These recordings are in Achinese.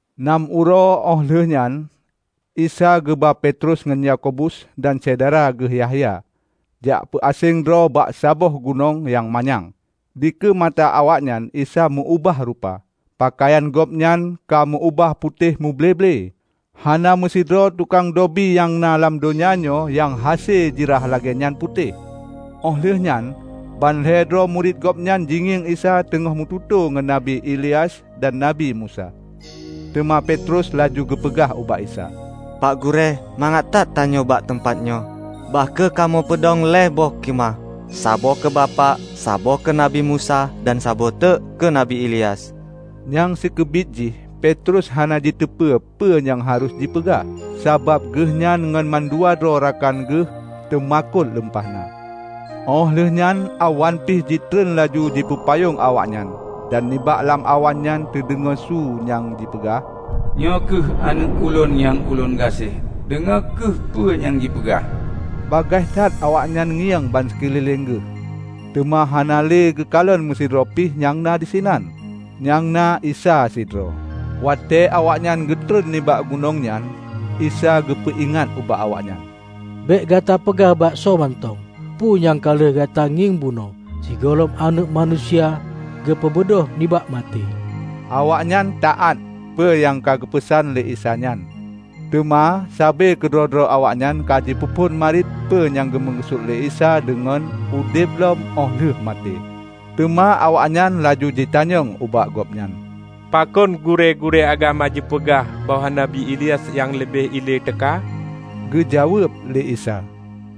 Nam uroe óh lheueh nyan Isa geuba Petrus ngon Yakobus dan syedara geuh Yahya, jak peu aséng droe bak saboh gunong nyang manyang. Dikeue mata awaknyan Isa meu-ubah rupa. Peukayan gobnyan ka meu-ubah putéh muble-ble. Hana meusidroe tukang dobi nyang na lam donya nyoe nyang hase ji rhah lagée nyan putéh. Óh lheueh nyan ban lhée droe murit Gobnyan jingieng Isa teungoh meututoe ngon Nabi Ilyas dan Nabi Musa. Teuma Petrus laju geupeugah ubak Isa, "Pak Gurée, mangat that tanyoe bak teumpat nyoe. Bah kheueh kamoe peudong lhée boh khimah: saboh keu Bapak, saboh keu Nabi Musa, dan saboh teuk keu Nabi Ilyas." Nyang sikeubiet jih Petrus hana jiteupeu peue nyang harôh jipeugah, sabab geuhnyan ngon mandua droe rakan geuh teumakot lumpah na. Óh lheueh nyan awan pih jitron laju jipeupayong awaknyan dan nibak lam awan nyan teudeungoe su nyang jipeugah, "Nyoe kheueh Aneuëk lôn nyang ulôn gaséh. Deungoe kheueh peue nyang jipeugah!" Bagaih that awaknyan ngieng bansikeulileng geuh, teuma hana le geukalon meusidroe pih nyang na disinan, nyang na Isa sidroe. Watée awaknyan geutron nibak gunong nyan, Isa geupeu ingat ubak awaknyan, "Bék gata peugah bak soe mantong peu nyang ka lheueh gata ngieng bunoe sigohlom Aneuëk Manusia geupeubeudôh nibak maté." Awaknyan taát peue nyang ka geupeusan lé Isa nyan, teuma sabe keudroe-droe awaknyan ka jipeuphon marit peue nyang geumeukeusut lé Isa deungon "udeb lom óh lheueh maté". Teuma awaknyan laju jitanyong ubak Gobnyan, "Pakon gurée-gurée agama jipeugah bahwa Nabi Ilyas nyang leubeh ilée teuka?" Geujaweueb lé Isa,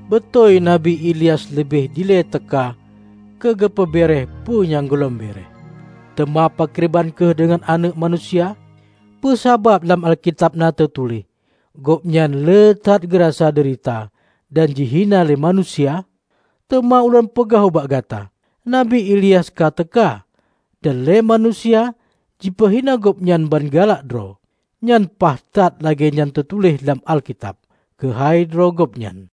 "Beutôi Nabi Ilyas leubeh ilée teuka keu geupeu béeréeh peue nyang gohlom béeréeh. Teuma pakriban kheueh deungon Aneuëk Manusia? Peue sabab lam Alkitab na teutuléh Gobnyan le that geurasa deurita dan jihina lé manusia? Teuma Ulôn peugah ubak gata: Nabi Ilyas ka teuka, dan lé manusia jipeuhina Gobnyan ban galak droe. Nyan paih that lagée nyan teutuléh lam Alkitab keuhai droe gobnyan."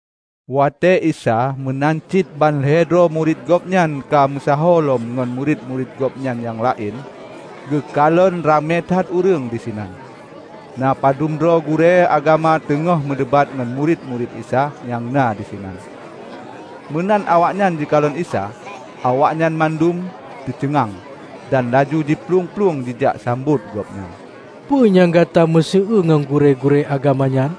Watée Isa meunan cit ban lhée droe murit Gobnyan ka meusaho lom ngon murit-murit Gobnyan nyang laén, geukalon ramé that ureuëng disinan. Na padubdroe gurée-gurée agama teungoh meudebat ngon murit-murit Isa nyang na disinan. Meunan awaknyan jikalon Isa, awaknyan mandum teuceungang, dan laju jiplueng-plueng jijak sambot Gobnyan. "Peue nyang gata meuseu-eue ngon gurée-gurée agama nyan?"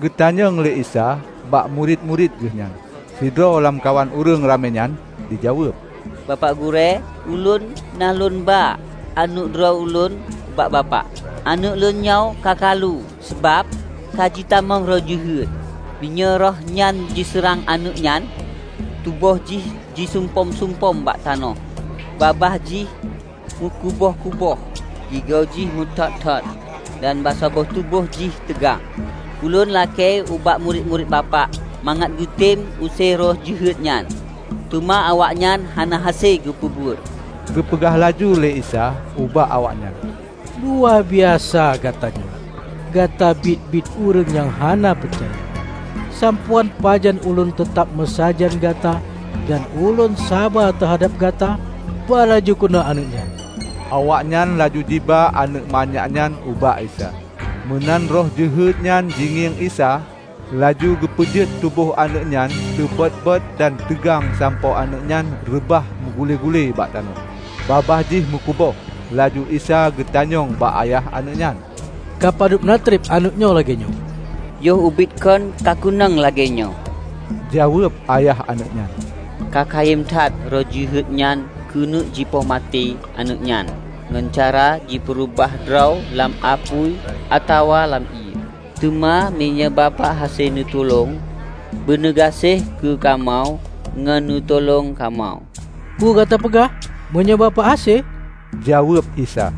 geutanyong lé Isa bak murit-murit Geuh nyan. Sidroe lamkawan ureuëng ramé nyan jijaweueb, "Bapak Gurée, ulôn na lôn ba aneuëk droe ulôn ubak Bapak. Aneuëk lôn nyoe ka kalu sabab ka jitamong roh jeuhet. Meunyoe roh nyan jiseurang aneuëk nyan, tuboh jih jiseumpom-seumpom bak tanoh, babah jih mukuboh-kuboh, gigo jih meuthot-thot dan bansaboh tuboh jih teugang. Ulôn lakée ubak murit-murit Bapak mangat geutem use roh jeuhet nyan, teuma awaknyan hana hase geupeubuet." Geupeugah laju lé Isa ubak awaknyan, "Luwa biasa gata nyoe! Gata biet-biet ureuëng nyang hana peucaya. Sampoe án pajan ulôn teutab meusajan gata dan lôn saba teuhadab gata? Ba laju keunoe aneuëk nyan!" Awaknyan laju jiba aneuëk manyak nyan ubak Isa. Meunan roh jeuhet nyan jingieng Isa, laju geupeujeuet tuboh aneuëk nyan teubot-bot dan teugang sampoe aneuëk nyan reubah meugule-gule bak tanoh. Babah jih meukuboh. Laju Isa geutanyong bak ayah aneuëk nyan, "Ka padub na treb aneuëk nyoe lagée nyoe?" "Yoh ubit kon ka keunong lagée nyoe!" jaweueb ayah aneuëk nyan. "Ka kayém that roh jeuhet nyan keuneuk jipoh maté aneuëk nyan ngon cara jipeureubah droe lam apui atawa lam ié. Teuma meunyoe Bapak hase neutulông, beuneugaséh kheueh kamoe ngon neutulông kamoe!" "Peue gata peugah? meunyoe Bapak hase?" jaweueb Isa.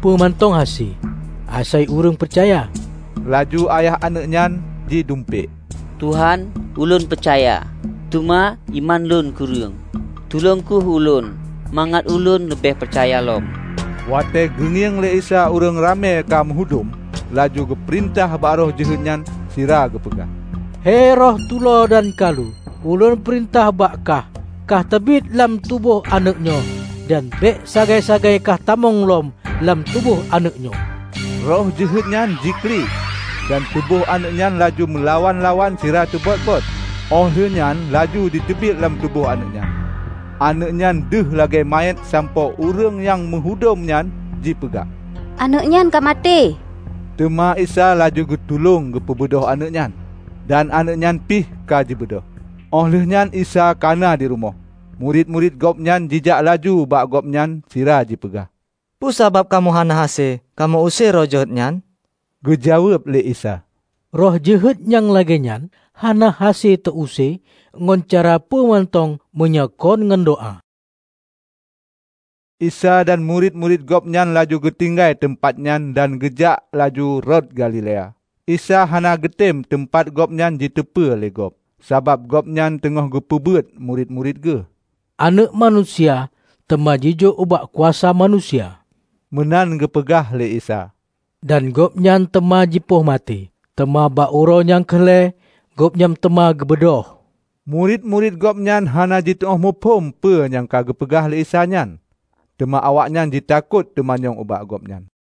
"Peue mantong hase, asai ureuëng peucaya!" Laju ayah aneuëk nyan jidumpék, "Tuhan, ulôn peucaya, teuma iman lôn kureueng. Tulông kheueh ulôn mangat ulôn leubeh peucaya lom!" Watée geungieng lé Isa ureuëng ramé ka meuhudom, laju geupeurintah bak roh jeuhet nyan sira geupeugah, "Hei Roh tulo dan kalu, ulôn peurintah bak kah kahteubiet lam tuboh aneuëk nyoe dan bék sagai-sagai kah tamong lom lam tuboh aneuëk nyoe!" Roh jeuhet nyan jiklik, dan tuboh aneuëk nyan laju meulawan-lawan sira teubot-bot, óh lheueh nyan laju jiteubiet lam tuboh aneuëk nyan. Aneuëk nyan deuh lagée manyét sampoe ureuëng nyang meuhudom nyan jipeugah, "aneuëk nyan ka maté!" Teuma Isa laju geutulông peubeudôh aneuëk nyan, dan aneuëk nyan pih ka jibeudôh. Óh lheueh nyan Isa kana di rumoh, murit-murit Gobnyan jijak laju ubak Gobnyan sira jipeugah, "Peue sabab kamoe hana hase kamoe use roh jeuet nyan?" Geujaweueb lé Isa, "Roh jeuhet nyang lagée nyan hana hase teu-use ngon cara peue mantong meunyoe kon ngon doá." Isa dan murit-murit Gobnyan laju geutinggai teumpat nyan dan geujak laju rot Galilea. Isa hana geutem teumpat Gobnyan jiteupeu lé gob, sabab Gobnyan teungoh geupeubeuet murit-murit Geuh. "Aneuëk Manusia teuma jijok ubak kuasa manusia," meunan geupeugah lé Isa, "dan Gobnyan teuma jipoh maté, teuma bak uroe nyang keu lhée Gobnyan teuma geubeudôh!" Murit-murit Gobnyan hana jituóh muphom peue nyang geupeugah lé Isa nyan, teuma awaknyan jitakot teumanyong ubak Gobnyan.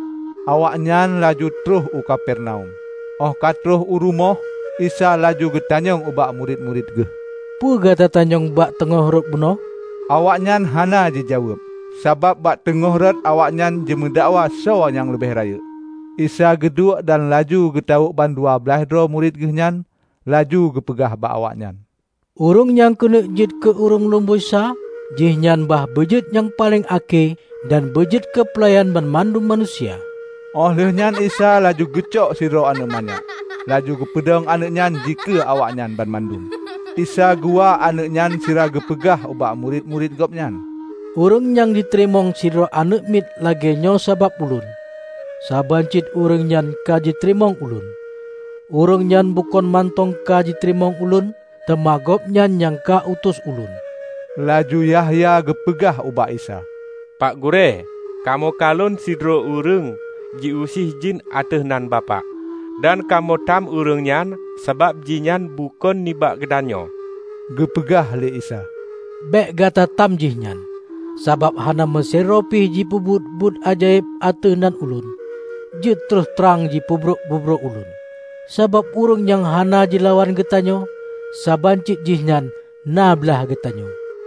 Awaknyan laju troh u Kapernaum. Óh ka troh u rumoh, Isa laju geutanyong ubak murit-murit Geuh, "Peue gata tanyong bak teungoh rot bunoe?" Awaknyan hana jijaweueb, sabab bak teungoh rot awaknyan jimeudakwa soe nyang leubeh rayeuk. Isa geuduek, dan laju geutawök bandua blaih droe murit Geuh nyan. Laju geupeugah bak awaknyan, "Ureuëng nyang keuneuk jeuet keu ureuëng lumboi sa, jihnyan bah beujeuet nyang paleng akhé dan beujeuet keupeulayan banmandum manusia." Óh lheueh nyan Isa laju geucok sidroe aneuëk manyak, laju geupeudong aneuëk nyan dikeue awaknyan banmandum. Isa geuwa aneuëk nyan sira geupeugah ubak murit-murit Gobnyan, "Ureuëng nyang jiteurimong sidroe aneuëk miet lagée nyoe sabab Ulôn, saban cit ureuëng nyan ka jiteurimong Ulôn, ureuëng nyan bukon mantong ka jiteurimong Ulôn, teuma gobnyan nyang ka utus Ulôn." Laju Yahya geupeugah ubak Isa, "Pak Gurée, kamoe kalon sidroe ureuëng jiuse jén ateueh nan Bapak. Dan kamoe tam ureuëng nyan sabab jihnyan bukon nibak geutanyoe." Geupeugah lé Isa, "Bék gata tam jihnyan, sabab hana meusidroe pih jipeubuet buet ajaéb ateueh nan Ulôn, jeuet troh trang jipeubrok-peubrok Ulôn. Sabab ureuëng nyang hana jilawan geutanyoe, saban cit jihnyan na blaih geutanyoe.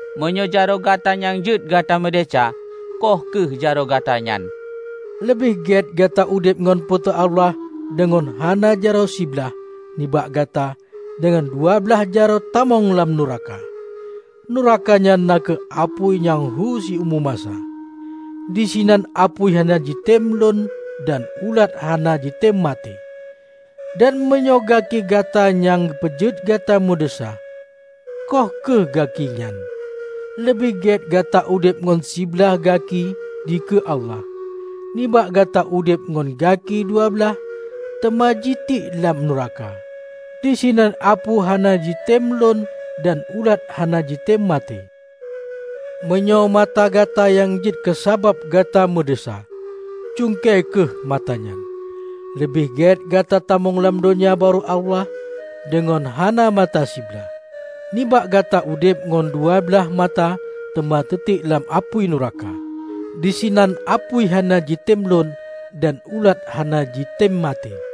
Meunyoe jaroe gata nyang jeuet gata meudesya, khoh kheueh jaroe gata nyan! Leubeh gét gata udeb ngon Po teu Allah deungon hana jaroe siblaih nibak gata deungon dua blaih jaroe tamong lam nuraka, nuraka nyan na kheueh apui nyang hu siumu masa. Disinan apui hana jitem lon dan ulat hana jitem maté. Dan meunyoe gaki gata nyang peujeuet gata meudesya, khoh kheueh gaki nyan. Leubeh gét gata udeb ngon siblaih gaki dikeue Allah, nibak gata udeb ngon gaki dua blaih teuma jitiek lam nuraka. Disinan apui hana jitem lon dan ulat hana jitem maté. Meunyoe mata gata nyang jeuet keusabab gata meudesya, cungke kheueh mata nyan! Leubeh gét gata tamong lam Donya Barô Allah deungon hana mata siblaih, nibak gata udeb ngon dua blaih mata teuma teutiek lam apui nuraka. Disinan apui hana jitem lon dan ulat hana jitem maté.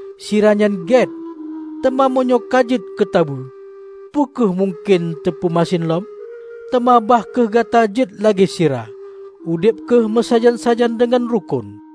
Sira nyan gét, teuma meunyoe ka jeuet keutabeue, peu kheueh mungken teupeu masen lom? Teuma, bah kheueh gata jeuet lagée sira -- udeb kheueh meusajan-sajan deungon rukon."